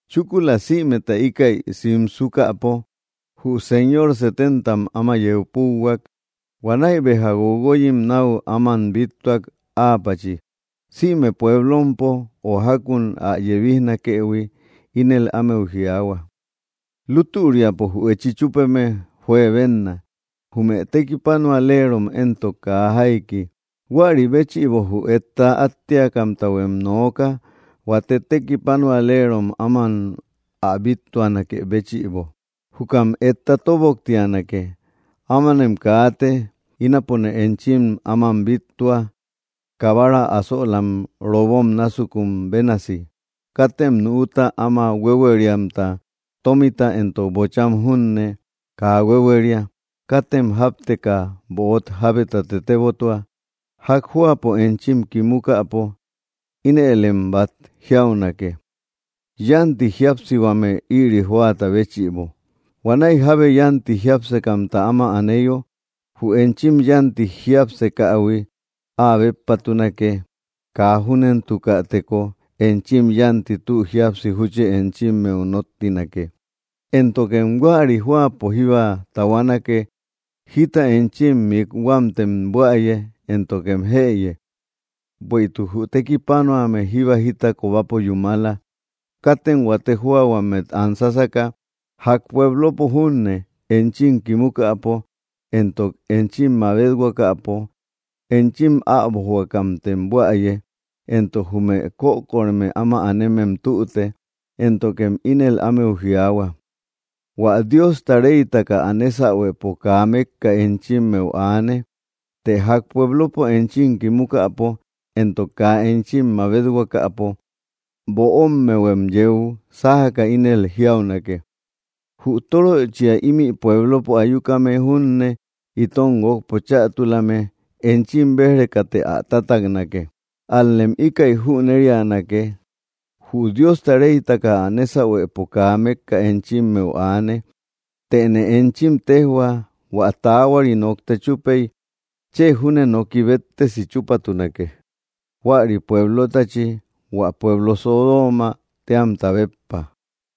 Chúkula sïmeta íkäi simsukäpo, jü Señor setentam áma yeu púuhuak. Huanäi béja guoguoyim náu áman bíttuak áapachi, sïme pueblompo o jákun ä yebijnakëhui. Ínel ámeu jiaahua: —Lútüriapo jü echi chúpeme juebenna, jume tekipanualerom éntok kaa jaiki. Huäri béchïbo jü etta áttiakamtahuem nooka, huate tekipanualerom áman ä bíttuanakë béchïbo, jukam etta tóboktianake. Ámanem kaate. Ínapone enchim áman bíttua, kabara asölam robom násukun bénasi. Katem nüuta áma huéhueriahuamta, tómita éntok bocham junne, kaa huéhueria. Katem jápteka böot jábeta tetebotua. Ják jóapo enchim kimukäpo, ínëlem bát jiaunake: ‘‘Yánti jíapsihuame ïri jóata béchïbo.” Huanäi jábe yánti jiápsekamta áma aneyo, jü enchim yánti jiápsekähui áa béppatunake. Kaa júnentukäteko, enchim yánti tü jíapsi, júchi enchimmeu nóttinake. Éntokem huäri jóapo jíba tahuanake, jita enchim mikhuamtem buäye, éntokem jëye. Bueïtuk jü tekipanuame jíba jita kobapo yúmala. Katem huate jóahuammet an sásaka. Ják pueblopo junne, enchim kimukäpo, éntok enchim mabethuakäpo, enchim äbojhuakämtem buäye. Éntok jume kökoreme áma anemem tüte, éntokem ínel ámeu jiaahua: ‘‘Huä Diosta reytaka ä nésahuepo kaa mékka enchimmeu aane.” Të ják pueblopo enchim kimukäpo, éntok kaa enchim mabethuakäpo, böommehuem yeu sájaka, ínel jiaunake: ‘‘Jü tóröchia ímï pueblopo ayukame junne, itom guókpo chätulame, enchim béj‑rekate ä tataknake. Ál‑lem íkäi jüneríanake, jü Diosta reytaka ä nésahuepo kaa mékka enchimmeu aane.” Tëne enchim téjhua hua taahuari nokta chúpey, chë júne noki béttesi chúpatunake, huäri pueblotachi, hua pueblo Sodoomä téamta béppa.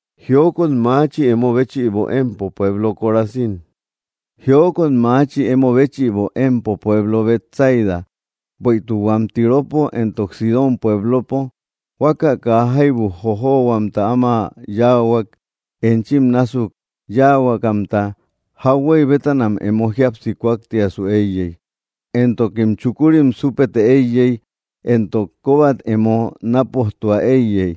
’¡Jiokot maachi, emo béchïbo, empo pueblo Corazín! ¡Jiokot maachi, emo béchïbo, empo pueblo Betsaida! Bueïtuk huam Tiropo éntok Sidón pueblopo huaka kaa jaibu jojohuamta áma yáahuak, enchim násuk yáahuakamta, jauhuey bétanam emo jíapsi kúaktiasu éiyey, éntokim chukurim súpete éiyey, éntok kóbat emo nápojtua éiyey.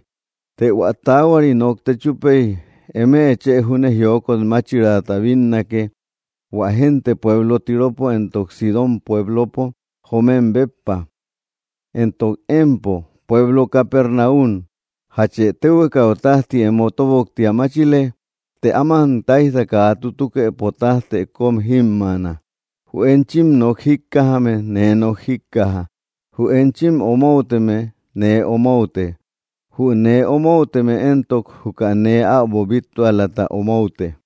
Të hua taahuari nokta chúpey, eme chë júne jiokot máchiraata bínnake, hua génte pueblo Tiropo éntok Sidón pueblopo joomem béppa. Éntok empo pueblo Capernaum, ¿jache téhuekau tájti emo tóboktia máchile? ¡Të áman táijta kaa tutukëpo tájtë kóm jímmaana! ’Jü enchim nok jíkkajame, nee nok jíkkaja; jü enchim omouteme, nee omoute; jü nee omouteme éntok, juka nee äbo bíttualata omoute.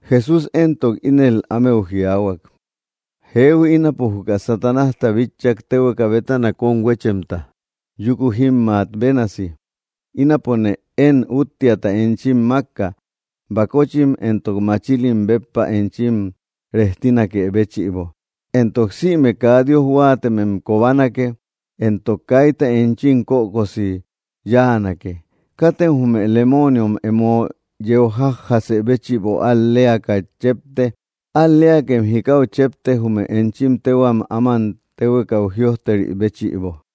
Jesús éntok ínel ámeu jiaahuak: —Jehui, ínapo juka Satanásta bitchak téhueka bétana kómhuéchemta yúku jímmaa bénasi. Ínapone én úttiata enchim mákka bakochim éntok machilim béppa enchim rejtinakë béchïbo, éntok sïme kaa Dios huáatemem kobanake, éntok kaita enchim kökosi yáanake. Katem jume lemooniom emo yeu jajjasë béchïbo al‑leaka chépte; al‑leakem jikau chépte, jume enchim téhuam áman téhuekau jïojteri béchïbo.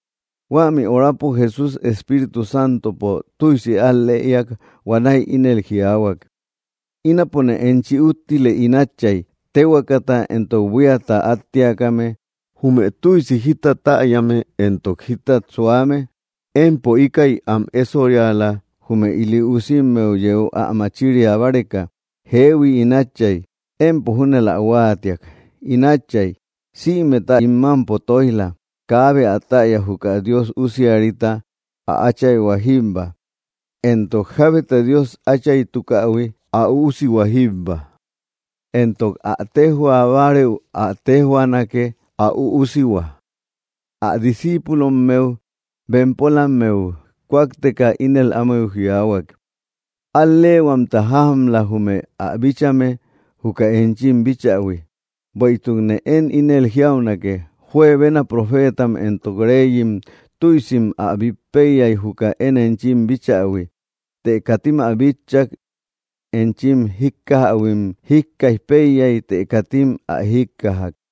Huämi horapo Jesús Espíritu Santopo tüisi al‑lëiak. Huanäi ínel jiaahuak: —Ínapone enchi úttile, ín Átchay, téhuekata éntok buíata áttiakame, jume tüisi jita täyame éntok jítat suame empo íkäi am ésoriala jume ili usimmeu yeu ä machiria báreka. Jeehui, ín Átchay, empo júnël ä huáatiak. ’In Átchay sïmeta ín mámpo tóij‑la. Kaabe ä täya juka Dios Usiarita, ä Áchayhua jíbba; éntok jábeta Dios Áchaytukähui, ä Üusihua jíbba; éntok ä téjhua bárëu ä téjhuaanake, ä Üusihua. Ä discíipulommeu bempolammeu kúakteka, ínel ámeu jiaahuak: —Al‑leehuamtam jájamla jume ä bíchame juka enchim bíchähui; bueïtukne én ínel jiaunake, juebena profeetam éntok reyim tüisim ä bít péiyay, juka én enchim bíchähui, të katim ä bitchak; enchim jíkkajähuim jíkkaij péiyay, të katim ä jíkkajak.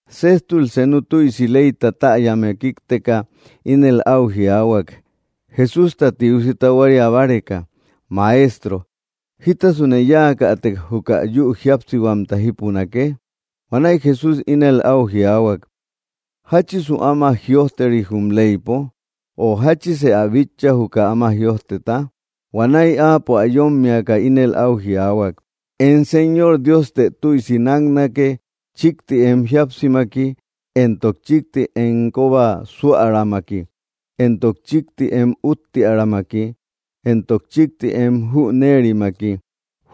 Séjtul senu tüisi leyta täyame kíkteka ínel áu jiaahuak, Jesústa tiusi tahuaria báreka: —Maestro, ¿jítasune yáakätek juka yü jíapsihuamta jípunake? Huanäi Jesús ínel áu jiaahuak: —¿Jáchisu áma jïojteri jum leypo? ¿O jáchise ä bitcha juka áma jïojteta? Huanäi áapo, ä yómmiaka, ínel áu jiaahuak: —“Em Señor Dioste tüisi náknake, chíkti em jíapsimaki, éntok chíkti em kóba súäramaki, éntok chíkti em úttiärammaki, éntok chíkti em jüneerimaki.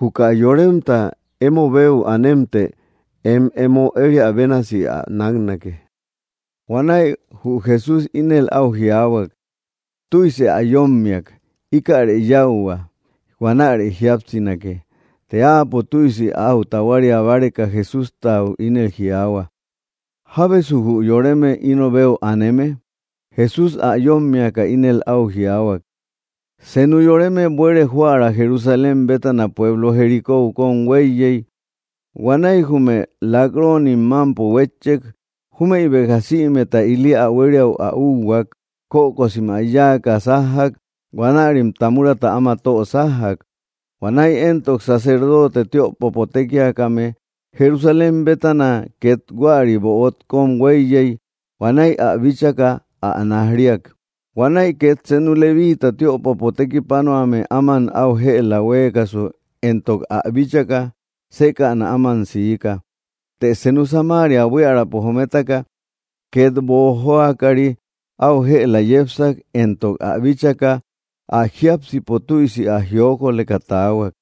Juka yoremta emo beu anemtë em emo ériä bénasi ä náknake.” Huanäi jü Jesús ínel áu jiaahuak: —Tüise ä yómmiak. Íkäre yáuhua; huanäre jíapsinake. Të áapo tüisi áu tahuaria báreka, Jesústau ínel jiaahua: —¿Jábesu jü yoreme ino beu aneme? Jesús, ä yómmiaka, ínel áu jiaahuak: —Senu yoreme buere joära Jerusalén bétana pueblo Jericóu kóm huéiyey, huanäi jume lak‑ronim mámpo huétchek júmëi béja sïmeta ili ä huériäu ä úhuak; kökosim ä yáaka sájjak, huanärim tamurata áma tö sájjak. Huanäi éntok sacerdoote tiöpopo tékiakame Jerusalén bétana két huäri böot kóm huéiyey. Huanäi ä bíchaka ä naj‑riak. Huanäi két senu leviita tiöpopo tekipanuame áman áu jëla huéekasu, éntok ä bíchaka, sékäna áman siika. Të senu Samaria buiärapo jometaka, két boojoakari, áu jëla yepsak, éntok ä bíchaka, ä jiápsipo tüisi ä jiokoleka taahuak.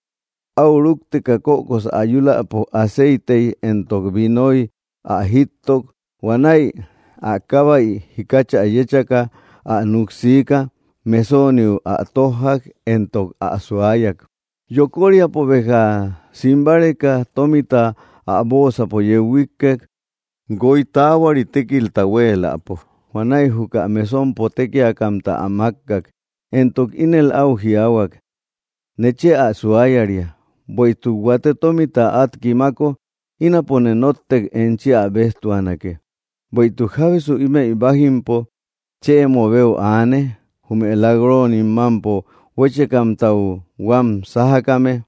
Áu rúkteka kökosä ayuläpo, aceitey éntok vinoy ä jíttok. Huanäi ä kábäit jikachä yéchaka, ä núk siika. Mesooniu ä tójjak, éntok ä suayak. Yokoríapo béja sim báreka, tómita ä bóosapo yeu huíkkek, guoy taahuari tékilta huéeläpo. Huanäi juka mesompo tékiakamta ä mákkak, éntok ínel áu jiaahuak: ‘‘Nechë ä suayaria. Bueïtuk huate tómita át kimako, ínapone nóttek enchi ä béjtuanake.” Bueïtuk, ¿jábesu ímëi bájimpo chë emo beu aane jume lak‑ronim mámpo huéchekamtau huám sájakame?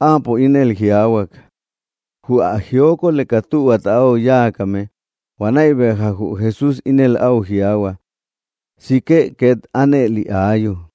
Áapo ínel jiaahuak: —Jü ä jiokoleka tühuata áu yáakame. Huanäi béja jü Jesús ínel áu jiaahua: —Sikë két ánëli áayu.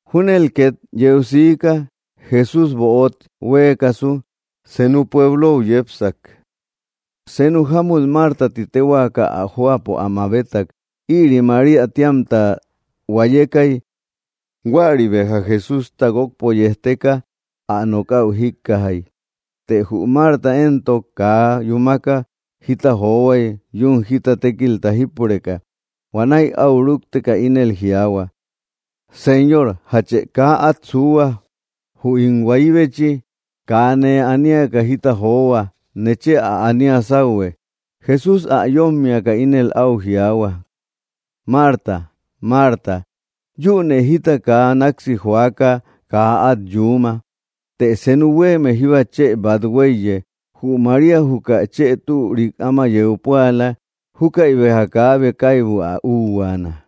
Júnel két yeu siika: Jesústa böot huéekasu, senu pueblou yepsak. Senu jámut Marta ti téhuaaka ä jóapo ä mabetak. Ïri María tíamta huayekay. Huäri béja Jesústa guókpo yejteka, ä nokäu jíkkajay. Të jü Marta éntok kaa yúmaka jita johuay, yún jita tékilta jípureka. Huanäi áu rúkteka, ínel jiaahua: —Señor, ¿jache kaa át suuhua, jü ín huayibechi? ¡Kaa nee aniaka jita johua! Nechë ä ania sáuhue. Jesús ä yómmiaka, ínel áu jiaahua: —Marta, Marta, yünë jita kaa náksi joaka, kaa át yuuma, të senu huéeme jíba chë bát huéiye. Jü María juka chë türik áma yeu púala. Júkäi béja kaabe kaibu ä úhuaana.